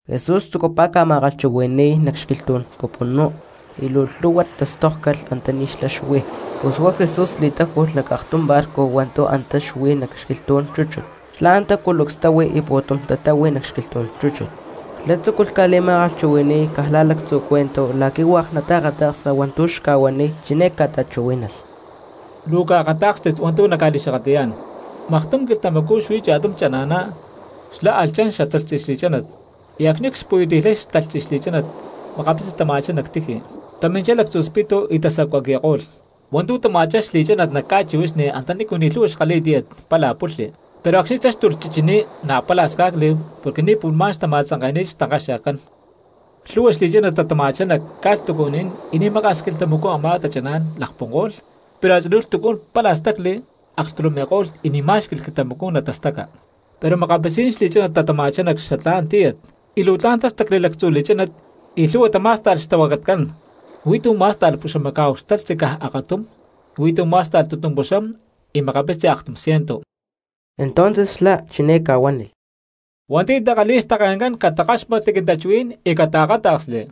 Jesús tzucupá ca̠ma̠kalhchuhui̠ni̠y cristianos nac xquilhtú̠n pupunú y luu lhu̠hua tastókcalh antaní xlá xuí. Pus huá Jesús li̠táju̠lh nac aktum barco hua̠ntu̠ antá xuí nac xquilhtú̠n chúchut, xlá antá culucs táhui y pu̠tum cristianos tatáhui nac xquilhtú̠n chúchut. Xlá tzúculh ca̠li̠ma̠kalhchuhui̠ni̠y cristianos caj la̠ lactzu cuento la̠qui̠ hua̠k nataakata̠ksa hua̠ntu̠ xca̠huaniy, chiné ca̠ta̠chuhuí̠nalh: —Luu caakatá̠kstit hua̠ntu̠ nacca̠li̠xakatli̠yá̠n: Maktum quilhtamacú xuí cha̠tum chana̠ná xlá alh chan xatalhtzi xli̠chánat. Y acxni̠ cxpuyuti̠lhay xtalhtzi xli̠chánat makapitzi tama̠chá nac tiji, taminchá lactzu spitu y tasacuaqui̠ko̠lh. Hua̠ntu̠ tama̠chá xli̠chánat nac ca̠chihuixni antanícu ni̠ lhu̠hua xkalhi̠y tíyat pálaj pulhli. Pero acxni̠ táxtulh chichiní na̠ pálaj sca̠cli porque ni̠ pu̠lhmá̠n xtama̠tzanke̠ni̠t xtankaxe̠kcán. Lhu̠hua xli̠chánat tatama̠chá nac ca̠lhtucuní̠n y ni̠ maka̠s quilhtamacú a̠má tachaná̠n lakpunko̠lh, pero a̠tzinú lhtucú̠n pálaj stacli, aklhtulumi̠ko̠lh y ni̠ má̠xqui̠lh quilhtamacú natastaca. Pero makapitzí̠n xli̠chánat tatama̠chá nac xatlá̠n tíyat y luu tla̠n tástacli lactzu li̠chánat y lhu̠hua tamá̠sta̠lh xtahuacatcán. Huí tu̠ má̠sta̠lh puxamacá̠hu xtalhtzi caj akatum, y huí tu̠ má̠sta̠lh tutumpuxám, y makapitzi aktum ciento. Entonces xlá chiné ca̠huánilh: —Hua̠nti̠ takalhi̠y xtake̠ncán catakáxmatli quintachuhuí̠n y cataakáta̠ksli.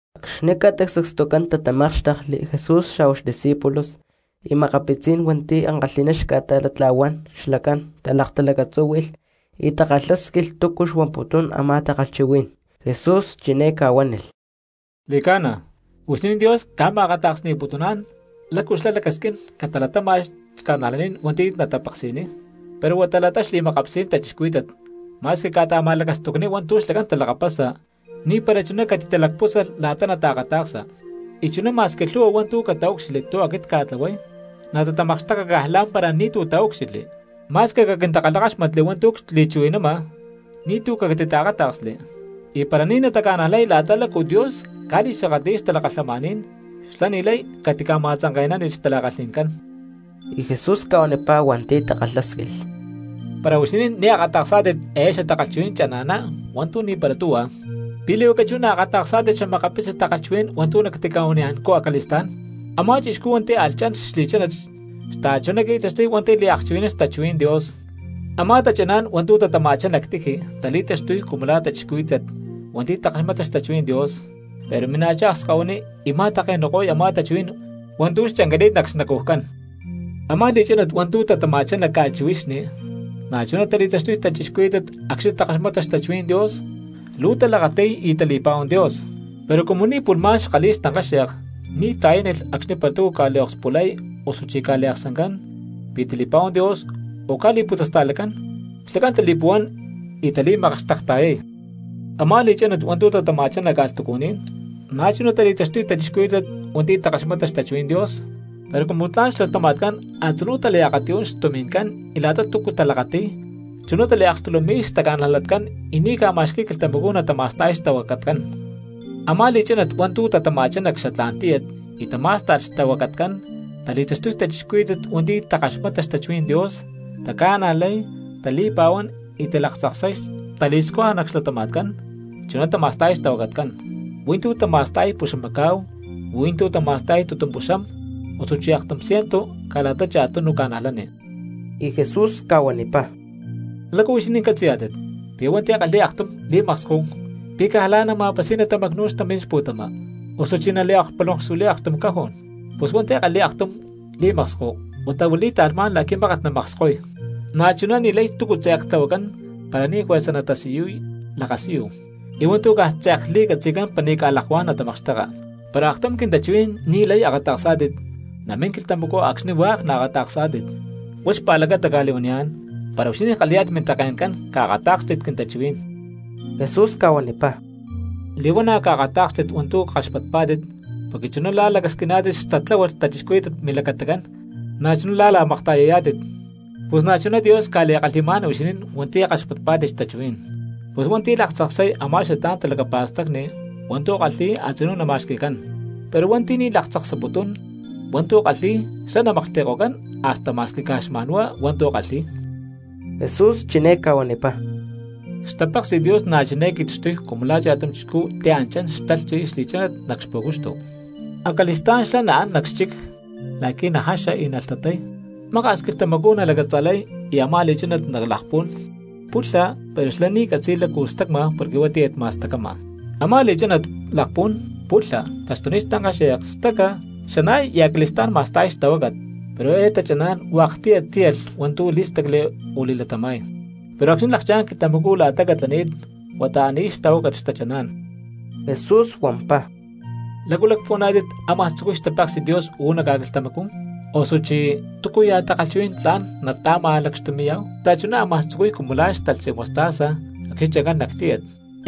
Acxni̠ ca̠ta sacstucán tatamákxtekli Jesús xa̠hua xdiscípulos y makapitzí̠n hua̠nti̠ ankalhi̠ná xca̠ta̠latla̠huán xlacán talaktalacatzúhui̠lh y takalhásquilh túcu xuamputún a̠má takalhchuhuí̠n. Jesús chiné ca̠huánilh: —Xli̠ca̠na, huixinín Dios ca̠ma̠akata̠ksni̠putuná̠n lácu xlá lacasquín catalatáma̠lh cristianos hua̠nti̠ natapeksi̠niy, pero huá la̠ta xli̠makapitzí̠n cristianos ma̠squi cca̠ta̠ma̠lacastucniy hua̠ntu̠ xlacán talakapasa ni̠para chuná catitalacpútzalh la̠ta nataakata̠ksa. Y chuná ma̠squi lhu̠hua hua̠ntu̠ cataúcxilhli tu̠ aquit cca̠tlahuay, natatamakxteka caj lá̠mpara ni̠tu̠ taúcxilhli; ma̠squi caquintakalhakáxmatli hua̠ntu̠ cchuhui̠nama ni̠tu̠cu catitaakáta̠ksli. Y para ni̠ nataca̠najlay la̠ta lácu Dios ca̠li̠xakatli̠y xtalakalhamaní̠n xlá ni̠lay catica̠ma̠tzanke̠nánilh xtala̠kalhi̠ncán. Y Jesús ca̠huanipá hua̠nti̠ takalhásquilh: —Para huixinín ni̠ akata̠ksá̠tit eé xatakalhchuhuí̠n chana̠ná hua̠ntu̠ ni̠para tuhua, ¿pi̠ li̠huacá chú naakata̠ksá̠tit xa̠makapitzi takalhchuhuí̠n hua̠ntu̠ nactica̠huaniya̠ncú acali̠stá̠n? Amá chixcú hua̠nti̠ alh chan xli̠chánat xta̠chuná qui̠taxtuy hua̠nti̠ liakchuhui̠nán xtachuhuí̠n Dios. Amá tachaná̠n hua̠ntu̠ tatama̠chá nac tiji tali̠taxtuy cumu la̠ cristianos hua̠nti̠ takaxmata xtachuhuí̠n Dios, pero mina̠chá akskahuiní y ma̠take̠nu̠ko̠y a̠má tachuhuí̠n hua̠ntu̠ xchancani̠t nac xnacujcán. Amá li̠chánat hua̠ntu̠ tatama̠chá nac ca̠chihuixni na̠chuná tali̠taxtuy cristianos acxni̠ takaxmata xtachuhuí̠n Dios, luu talakati̠y y tali̠pa̠huán Dios. Pero cumu ni̠ pu̠lhmá̠n xkalhi̠y xtankáxe̠k ni̠ ta̠yánilh acxni̠ para túcu ca̠liokspulay osuchí ca̠liaksancán pi̠ tali̠pa̠huán Dios o ca̠li̠putzasta̠lacán, xlacán tali̠puhuán y tali̠makxtekta̠yay. Amá li̠chánat hua̠ntu̠ tatama̠chá nac ca̠lhtucuní̠n, na̠chuná tali̠taxtuy cristianos hua̠nti̠ takaxmata xtachuhuí̠n Dios, pero cumu tla̠n cxlatama̠tcán a̠tzinú taliakatiyún xtumi̠ncán y la̠ta túcu talakati̠y, chuná taliaklhtulumi̠y xtaca̠najlatcán y ni̠ ca̠ma̠xqui̠y quilhtamacú natama̠sta̠y xtahuacatcán. Amá li̠chánat hua̠ntu̠ tatama̠chá nac xatlá̠n tíyat y tamá̠sta̠lh xtahuacatcán tali̠taxtuy cristianos hua̠nti̠ takaxmata xtachuhuí̠n Dios, taca̠najlay, tali̠pa̠huán y talaktzaksay tali̠scuja nac xlatama̠tcán, chuná tama̠sta̠y xtahuacatcán: hui̠ntú tama̠sta̠y puxamacá̠hu y hui̠ntú tama̠sta̠y tutumpuxam osu aktum ciento caj la̠ta cha̠tunu cristianos. Y Jesús ca̠huanipá: —¿Lácu huixinín catzi̠yá̠tit, pi̠ hua̠nti̠ kalhi̠y aktum lámpara pi̠ caj la̠ nama̠pasi̠y natamacnu̠y nac xtampí̠n xpu̠tama? ¿Osuchí naliakpulonkxuili̠y aktum cajón? Pus hua̠nti̠ kalhi̠y aktum lámpara huata huili̠y ta̠lhmá̠n la̠qui̠ mákat namakskoy. Na̠chuná ni̠lay túcu tze̠k tlahuacán para ni̠ juerza natasiyuy lakasiyu, y hua̠ntu̠ caj tze̠k li̠catzi̠cán para ni̠ ca̠lakuá̠n natamakxteka. Para aktum quintachuhuí̠n ni̠lay akata̠ksá̠tit namín quilhtamacú acxni hua̠k naakata̠ksá̠tit. Huá xpa̠lacata cca̠li̠huaniyá̠n, para huixinín kalhi̠yá̠tit mintake̠ncán caakatá̠kstit quintachuhuí̠n. Jesús ca̠huanipá: —Li̠huana̠ caakatá̠kstit hua̠ntu̠ kaxpatpá̠tit porque chuná la̠ lacasquiná̠tit xtatláhualh cristianos milacatacán na̠chuná la̠ la̠makta̠yayá̠tit, pus na̠chuná Dios ca̠li̠kalhi̠má̠n huixinín hua̠nti̠ kaxpatpá̠tit xtachuhuí̠n. Pus hua̠nti̠ laktzaksay akata̠ksa a̠má xatlá̠n talacapa̠stacni hua̠ntu̠ kalhi̠y a̠tzinú nama̠xqui̠cancú; pero hua̠nti̠ ni̠ laktzaksaputún akata̠ksa hua̠ntu̠ kalhi̠y xlá namaklhti̠ko̠cán hasta ma̠squi caj xma̠nhuá hua̠ntu̠ kalhi̠y. Jesús chiné ca̠huanipá: —Xtapéksi̠t Dios na̠ chiné qui̠taxtuy cumu la̠ cha̠tum chixcú ti̠ án chán xtalhtzi xli̠chánat nac xpu̠cuxtu. Acali̠stá̠n xlá án nac xchic la̠qui̠ najaxa y nalhtatay. Maka̠s quilhtamacú nalacatza̠lay y a̠má li̠chánat lakpún, pulha, pero xlá ni̠ catzi̠y lácu stacma porque huá tíyat ma̠stacama. Amá li̠chánat lakpún, pulha, taxtuniy xtankáxe̠k, staca, xana̠y y acali̠stá̠n ma̠sta̠y xtahuácat. Pero eé tachaná̠n hua̠k ctíyat tíyalh hua̠ntu̠ lí̠stacli osu li̠latama̠y. Pero acxni̠ lakchá̠n xquilhtamacú la̠ta catlani̠t huata án í̠y xtahuácat xtachaná̠n. Jesús huampá: —¿Lácu lacpuhuaná̠tit ámaj tzucuy xtapéksi̠t Dios uú nac ca̠quilhtamacú? Osuchí ¿túcuya̠ takalhchuhuí̠n tla̠n ta̠ma̠lacxtumi̠yá̠hu? Xta̠chuná ámaj tzucuy cumu la̠ xtalhtzi mostaza acxni̠ chancán nac tíyat.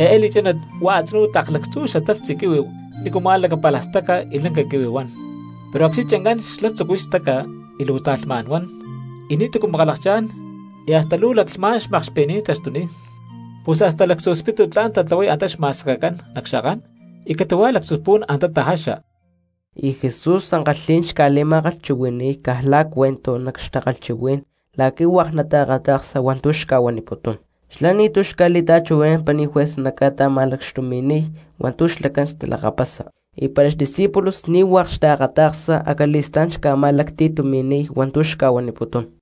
Eé li̠chánat huá a̠tzinú tlak lactzú xatalhtzi quihui nícuma̠ lacapálaj staca y lanca quihui huan. Pero acxni̠ chancán xlá tzucuy staca y luu ta̠lhmá̠n huan; y ni̠tu̠cu makalakchá̠n, y hasta luu laclhmá̠n xmakxpi̠ní̠n taxtuniy, pus hasta lactzu spitu tla̠n tatlahuay antá xma̠sekecán nac xakán y catu̠huaj lactzu spu̠n antá tajaxa. Y Jesús ankalhí̠n xca̠li̠ma̠kalhchuhui̠ni̠y cristianos caj la̠ cuento nac xtakalhchuhuí̠n la̠qui̠ hua̠k nataakata̠ksa hua̠ntu̠ xca̠huaniputún. Xlá ni̠tu̠ xca̠li̠ta̠chuhui̠nán para ni̠ juerza naca̠ta̠ma̠lacxtumi̠niy hua̠ntu̠ xlacán xtalakapasa; y para xdiscípulos ni̠ hua̠k xtaakata̠ksa acali̠stá̠n xlá xca̠ma̠lacti̠tumi̠niy hua̠ntu̠ xca̠huaniputún.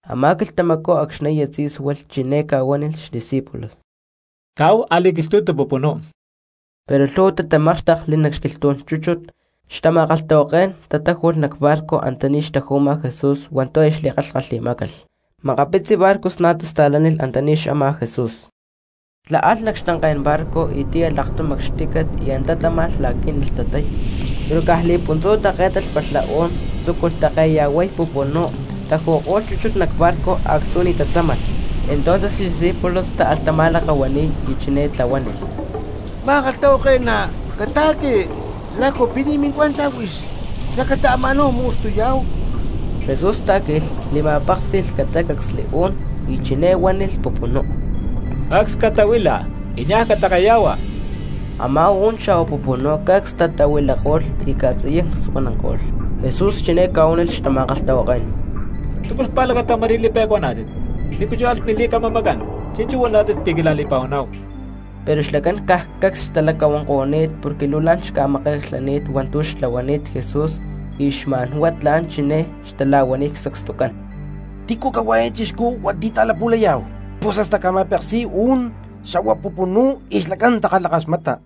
Amá quilhtamacú acxni̠ aya tzí̠sualh chiné ca̠huánilh xdiscípulos: —Caáhu a̠li̠quilhtu̠tu pupunú. Pero lhu̠hua cristianos tatamákxtekli nac xquilhtú̠n chúchut, xtama̠kalhtahuaké̠n tatáju̠lh nac barco antaní xtaju̠ma Jesús hua̠ntu̠ aya xli̠kalhkalhi̠má̠calh. Makapitzi barcos na̠ tasta̠lánilh antaní xama Jesús. Xlá alh nac xtanké̠n barco y tíyalh aktum acxtícat y antá táma̠lh la̠qui̠ nalhtatay. Pero caj li̠puntzú také̠talh palha u̠n, tzúculh ta̠keya̠huay pupunú, taju̠ko̠lh chúchut nac barco a̠actzú ni̠ tatzámalh. Entonces xdiscípulos táalh tama̠lakahua̠ni̠y y chiné tahuánilh: —Ma̠kalhtahuake̠ná, cata̠qui. ¿Lácu pi̠ ni̠ mincuenta huix xlacata ama̠náhu mu̠xtuyá̠hu? Jesús tá̠qui̠lh, li̠ma̠péksi̠lh catácacsli u̠n y chiné huánilh pupunú: —¡Cacs catahuila y niaj cata̠keya̠hua! Amá u̠n xa̠hua pupunú cacs tatahuilako̠lh y ca̠tziyancsuananko̠lh. Jesús chiné ca̠huánilh xtama̠kalhtahuaké̠n: —¿Túcu xpa̠lacata ma̠rí li̠pe̠cuaná̠tit? ¿Nícu chú álh mili̠camamacán, chi̠nchú huaná̠tit pi̠ quila̠li̠pa̠huaná̠hu? Pero xlacán caj cacs xtalacahuanko̠ni̠t porque luu la̠n xca̠make̠klhani̠t hua̠ntu̠ xtlahuani̠t Jesús y xma̠n huá tla̠n chiné xtala̠huaniy sacstucán: —¿Tícu cahuá eé chixcú hua̠nti̠ ta̠lapu̠layá̠hu, pus hasta ca̠ma̠peksi̠y u̠n xa̠hua pupunú y xlacán takalhakaxmata?